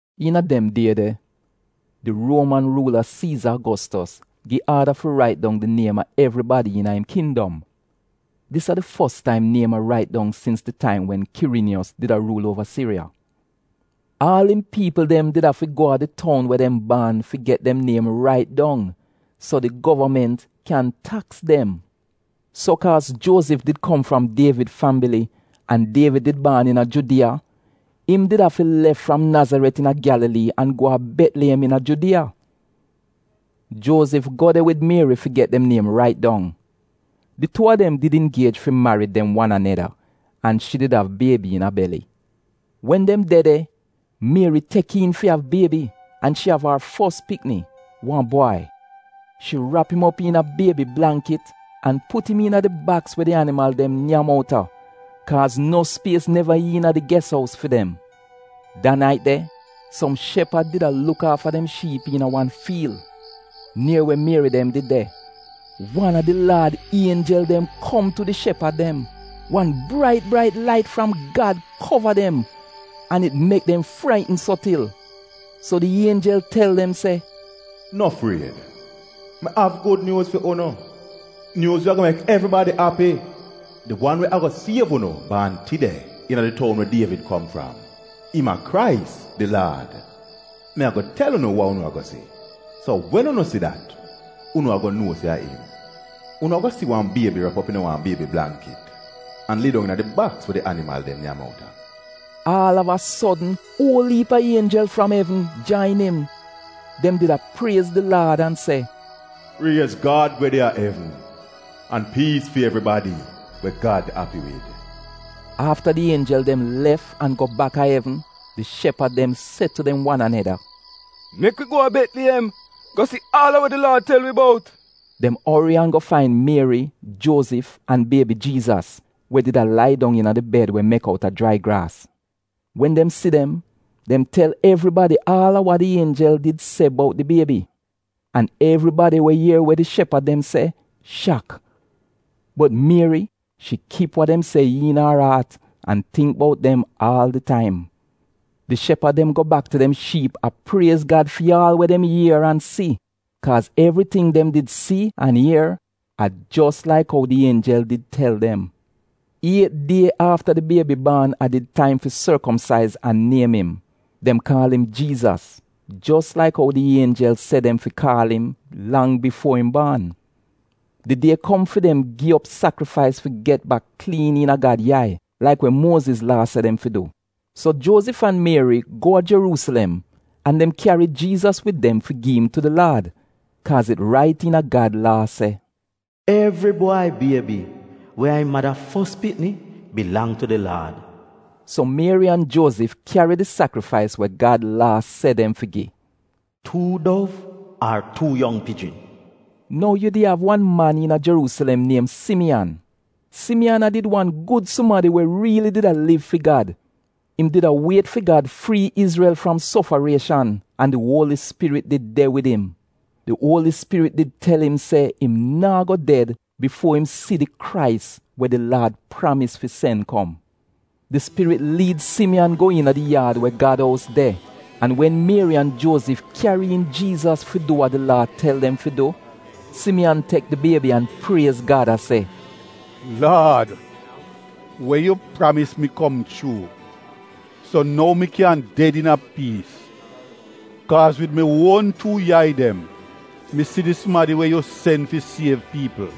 Iina dem die de, di Ruoman ruula, Siiza Agostos, gi aada fi rait dong di niem a evribadi iina im kindom. (Dis a di fos taim niem a rait dong sins di taim wen Kiriniyos did a ruul uova Siriya.) Aal im piipl dem did afi go a di toun we dem baan fi get dem niem rait dong, so di govament kyan taks dem. So kaaz Juozif did kom fram Dievid fambili an Dievid did baan iina Judiya, im did afi lef fram Nazaret iina Gyalalii an go a Betliyem iina Judiya. Juozif go de wid Mieri fi get dem niem rait dong. Di tuu a dem did ingiej fi marid dem wan aneda an shi did av biebi iina beli. Wen dem de de, Mieri tek iin fi av biebi, an shi av ar fos pikni, wan bwai. Shi rap im op iina biebi blangkit an put im iina di baks we di animal dem nyam outa, kaaz no spies neva iina di ges ous fi dem. Da nait de, som shepad did a luk aafa dem shiip iina wan fiil, nier we Mieri dem did de. Wan a di Laad ienjel dem kom tu di shepad dem. Wan brait brait lait fram Gad kova dem an it mek dem fraitn so til. So di ienjel tel dem se, “No fried! Mi av gud nyuuz fi unu. Nyuuz we ago mek evribadi api. Di wan we ago siev unu baan tide iina di toun we Dievid kom fram. Im a Krais, di Laad. Mi ago tel unu wa unu ago si, so wen unu si dat unu ago nuo se a im. Unu ago si wan biebi rap op iina wan biebi blangkit an a lidong iina di baks we di animal dem nyam outa.” Aal av a sodn uol iip a ienjel fram evn, jain im. Dem did a priez di Laad an se, “Priez Gad we de a evn, an piis fi evribadi we Gad api wid.” Afta di ienjel dem lef an go baka evn, di shepad dem se tu dem wan aneda, “Mek wi go a Betliyem go si aal a wa di Laad tel wi bout.” Dem ori an go fain Mieri, Juozif an biebi Jiizas, we did a lai dong iina di bed we mek outa jrai graas. Wen dem si dem, dem tel evribadi aal a wa di ienjel did se bout di biebi. An evribadi we ier wa di shepad dem se, shak. Bot Mieri, shi kip wa dem se iina ar aat an tingk bout dem aal di taim. Di shepad dem go bak tu dem shiip a priez Gad fi aal we dem ier an si, kaaz evriting dem did si an ier a jos laik ou di ienjel did tel dem. Iet die afta di biebi baan a did taim fi sorkomsaiz an niem im. Dem kaal im Jiizas. Jos laik ou di ienjel se dem fi kaal im, lang bifuo im baan. Di die kom fi dem gi op sakrifais fi get bak kliin iina Gad yai, laik we Muoziz Laa se dem fi du. So Juozif an Mieri go a Jeruusilem an dem kyari Jiizas wid dem fi gi im tu di Laad, (kaaz it rait iina Gad Laa se, “Evri bwai biebi we a im mada fos pikni bilang tu di Laad.”) So Mieri an Juozif kyari di sakrifais we Gad Laa se dem fi gi, “tuu dov ar tuu yong pijin.” Nou yu di av wan man iina Jeruusilem niem Simiyan. Simiyan a did wan gud sumadi we riili did a liv fi Gad. Im did a wiet fi Gad frii Izrel fram sofarieshan an di Uoli Spirit did de wid im. Di Uoli Spirit did tel im se im naa go ded bifuo im si di Krais we di Laad pramis fi sen kom. Di Spirit liid Simiyan go iina di yaad we Gad ous de an wen Mieri an Juozif kyari iin Jiizas fi du wa di Laa tel dem fi du, Simiyan tek di biebi an priez Gad a se, “Laad, we yu pramis mi kom chuu, so nou mi kyan ded iina piis. Kaaz wid mi uon tuu yai dem, mi si di sumadi we yu sen fi siev piipl.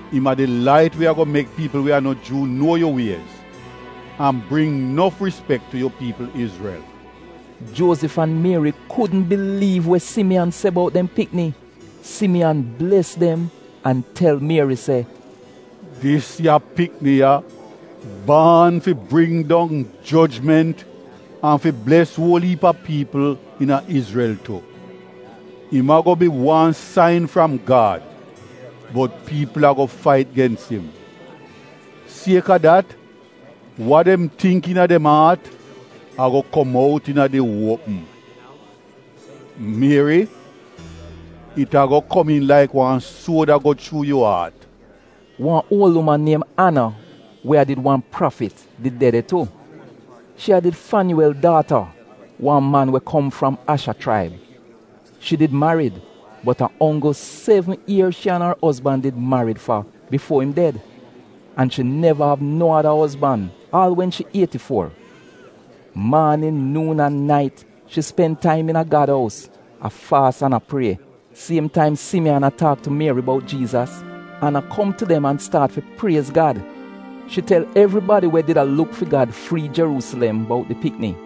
im a di lait we ago mek piipl we a no Juu nuo yu wiez an bring nof rispek tu yu piipl Izrel.” Juozif an Mieri kudn biliiv we Simiyan se bout dem pikni. Simiyan bles dem an tel Mieri se, “Dis ya pikni ya baan fi bring dong jojment an fi bles uol iip a piipl iina Izrel tu. Im ago bi wan sain fram Gad bot piipl ago fait gens im. Sieka dat, wa dem tingk iina dem aat ago kom out iina di uopm. Mieri it ago komiin laik wan suod a go chuu yu aat.” Wan uol uman niem Ana we a did wan prafit did de de tu. Shi a did Fanyuuwel daata, wan man we kom fram Asha chraib. Shi did marid, bot a onggl sevn ier shi an ar ozban did marid fa bifuo im ded. An shi neva av no ada ozban aal wen shi ieti fuo. Maanin, nuun an nait, shi spen taim iina Gad ous, a faas an a prie. Siem taim Simiyan a taak tu Mieri bout Jiizas, Ana kom tu dem an staat fi priez Gad. Shi tel evribadi we did a luk fi Gad fi frii Jeruusilem, bout di pikni.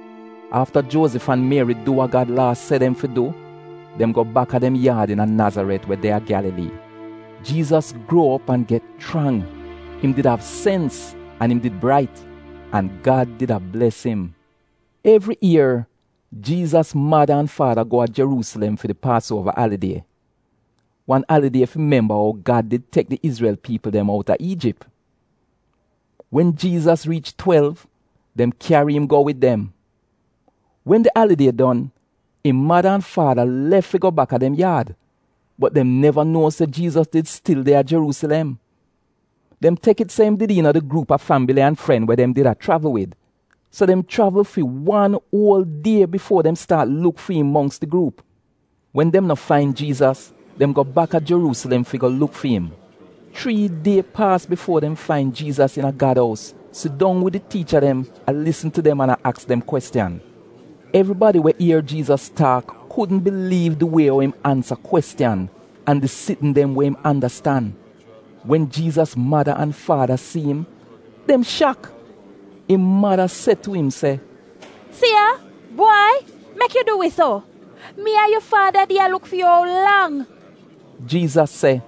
Afta Juozif an Mieri du wa Gad Laa se dem fi du, dem go baka dem yaad iina Nazaret we de a Gyalalii. Jiizas gruo op an get chrang. Im did av sens an im did brait. An Gad did a bles im. Evri ier, Jiizas mada an faada go a Jeruusilem fi di Paasuova alidie — wan alidie fi memba ou Gad did tek di Izrel piipl dem outa Iijip. Wen Jiizas riich twelv, dem kyari im go wid dem. Wen di alidie don, im mada an faada lef fi go baka dem yaad, bot dem neva nuo se Jiizas did stil de a Jeruusilem. Dem tek it se im did iina di gruup a fambili an fren we dem did a chravl wid; so dem chravl fi wan uol die bifuo dem staat luk fi im mongks di gruup. Wen dem no fain Jiizas, dem go baka Jeruusilem fi go luk fi im. Chrii die paas bifuo dem fain Jiizas iina Gad ous, sidong wid di tiicha dem, a lisn tu dem, an a aks dem kwestiyan. Evribadi we ier Jiizas taak kudn biliiv di wie ou im ansa kwestiyan an di sitn dem we im andastan. Wen Jiizas mada an faada si im, dem shak. Im mada se tu im se, “Si ya! Bwai, mek yu du wi so? Mi an yu faada did a luk fi yu ou lang!” Jiizas se,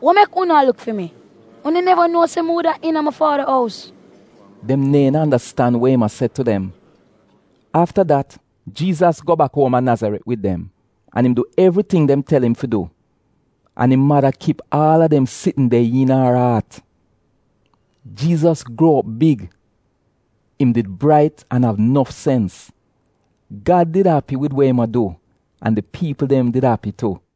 “Wa mek unu a luk fi mi? Unu neva nuo se mi wuda iina mi faada ous?” Dem neehn andastan wa im a se tu dem. Afta dat Jiizas go bak uom a Nazaret wid dem an im du evriting dem tel im fi du. An im mada kip aal a dem sitn de iina ar aat. Jiizas gruo op big. Im did brait an av nof sens. Gad did api wid wa im a du an di piipl dem did api tu.